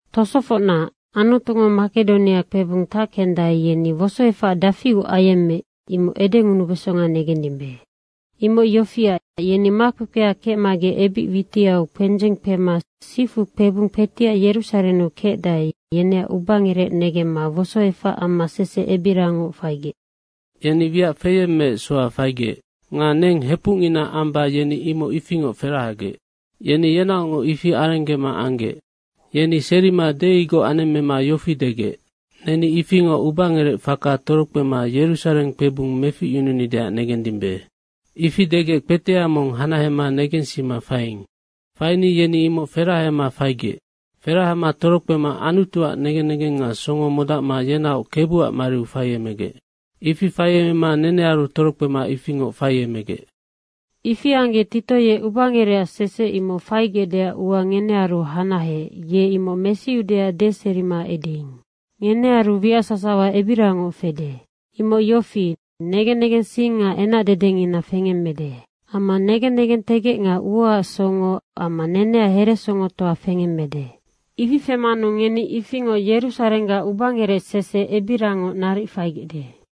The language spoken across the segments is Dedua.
Tosofocna, Anutungo Makedonia kpebung tackendae, yeni wosoefac dafiu ayemmeec, imoc edengunubesonga negendimbe. Imoc yofiac, yeni makpekpea kecma ebic witiau kpendzeng kpema sifu kpebung kpetiac Yerusarennu kecdae, yeneac ubangerec negemma wosoefac amma sese ebirangoc faigec. Yeni wiac feyemmeec soha faigec. Nga neng hepucngina amba yeni imoc ifingoc ferahagec. Yeni yenaocngoc ifi arenggema anggec. Yeni serima deigoc anemmema yofi degec, “Neni ifingoc ubangerec faka torokpema Yerusareng kpebung meficyununideac negendimbe.” ifi degec kpetea mong hanahema negensima faiing. Faini yeni imoc ferahama faigec. Ferahama torokpema Anutuac negen negeng nga songo modacma yenaoc Kebuac mariu faiemegec. Ifi faiemema nenearu torokpema ifingoc faiemegec. Ifi anggec, Tito ye ubangerec sese imoc faigecdeac ua ngenearu hanaheec, ye imoc mesiudeac deserima edeing. Ngenearu wiac sasawa ebirangoc fede, imoc yofi, negen negensing nga enac dedengina fengemmede. Amma negen negentegec nga uaac songo amma neneac heresongotoa fengemmede. Ifi femanu ngeni ifingoc Yerusarenggac ubangerec sese ebirangoc naric faigecde.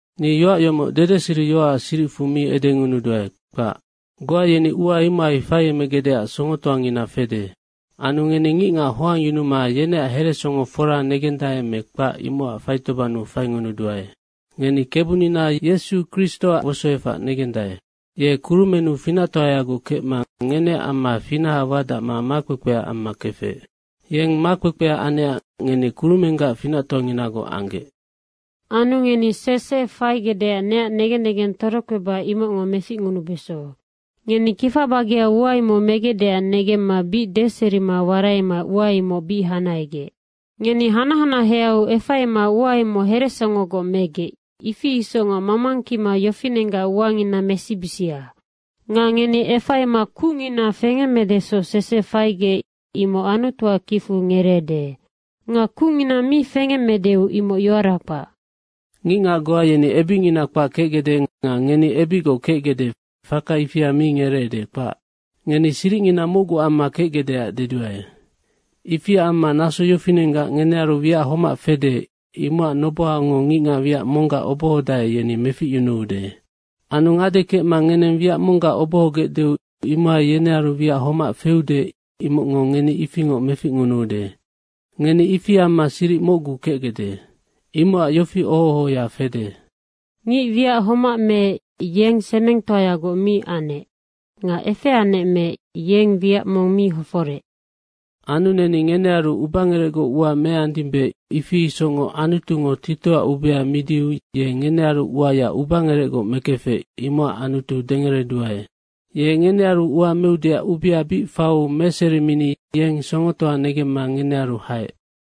Ni yoac yomoc dedeseriyoacac siricfu mi edengunuduae, kpac. Goa yeni ua imohai faiemegecdeac songotoangina fede. Anu ngeni ngicngac hoangyunuma yeneac heresongo fora negendae me kpac imocac faitobannu faingunuduae. Ngeni Kebunina Yesu Kristoac wosoefac negendae. Ye kurumennu finactoayagoc kecma ngeneac amma finaha wadacma makpekpea amma kefec. Yeng makpekpea anecac ngeni kurumenggac finactoanginagoc anggec. Anu ngeni sese faigecdeac neac negen negeng torokpeba imocngo meficngunubeso. Ngeni kifa bageau ua imoc megecdeac negemma bic deserima waraima ua imoc bic hanahegec. Ngeni hanac hanaheau efaima ua imoc heresongogoc megec, ifi isocngoc mamangkima yofinenggac uangina mesibisia. Nga ngeni efaima kucngina fengemmedesoc sese faigec, imoc Anutuac kicfu ngereede. Nga kucngina mi fengemmedeu imoc yoara kpac. Ngicngac goa yeni ebicngina kpac kecgecde nga ngeni ebicgoc kecgecde, faka ifia mi ngereede, kpac. Ngeni siricngina mocgu amma kecgecdeac deduae. Ifiac amma naso yofinenggac ngenearu wiac homac fede, imocac nobohango ngicngac wiac monggac obohodae, yeni meficyunuude. Anu ngade kecma ngeneng wiac monggac obohogecdeu, imohai yenearu wiac homac feude, imocngo ngeni ifingoc meficngunuude. Ngeni ifi amma siric mocgu kecgecde. Imocac yofi oho ohoya fede, “Ngic wiac homac meec, yeng semengtoagoc mi anec nga efeanec meec, yeng wiac mong mi hoforec.” Anu neni ngenearu ubangerecgoc ua meandimbe, ifi isocngoc Anutungo Titoac ubea midiu ye ngenearu uaya ubangerecgoc mekefec, imocac Anutu dengereduae. Ye ngenearu ua meudeac ubea bic faiu meserimini yeng songotoa negemma ngenearu haec.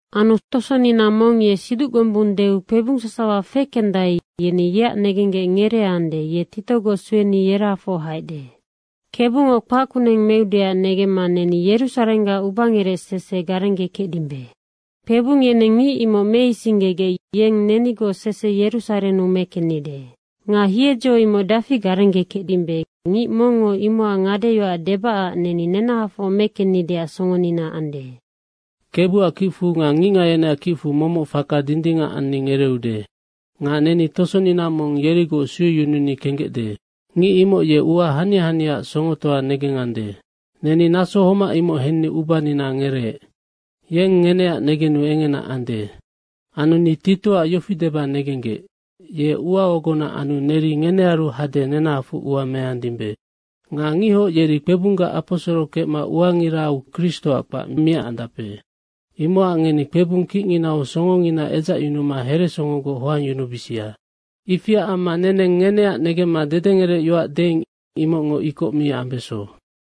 Anu tosonina mong, ye siduc gombung deu kpebung sasawa fekendae, yeni yeac negenggec ngereeande, ye Titogoc sueni yerahafoc haecde. Kebungo kpac kuneng meudeac negemma neni Yerusarenggac ubangerec sese garenggekecdimbe. Kpebung yeneng ngic imoc meisinggegec yeng nenigoc sese Yerusarennu mekennide. Nga hiedzo imoc dafi garenggekecdimbe, ngic mongngo imocac ngadeyoac debacac neni nenahafoc mekennideac songonina ande. Kebuac kicfu nga ngicngac yeneac kicfu momoc faka dindingac anni ngereeude. Nga neni tosonina mong yerigoc sueyununi kenggecde. Ngic imoc ye ua hania haniaac songotoa negengande, neni naso homac imoc henni ubanina ngereec. Yeng ngeneac negenu engena ande. Anu ni Titoac yofi deba negenggec, ye ua ogona anu neri ngenearu hade nenahafoc ua meandimbe. Nga ngihoc yeri kpebunggac aposoro kecma uangirau Kristoac kpac miacandape. Imocac ngeni kpebung kicnginau songongina edzacyunuma heresongogoc hoangyunubisia. Ifiac amma neneng ngeneac negemma dedengerecyoac deing, imocngo ikoc mi ambeso.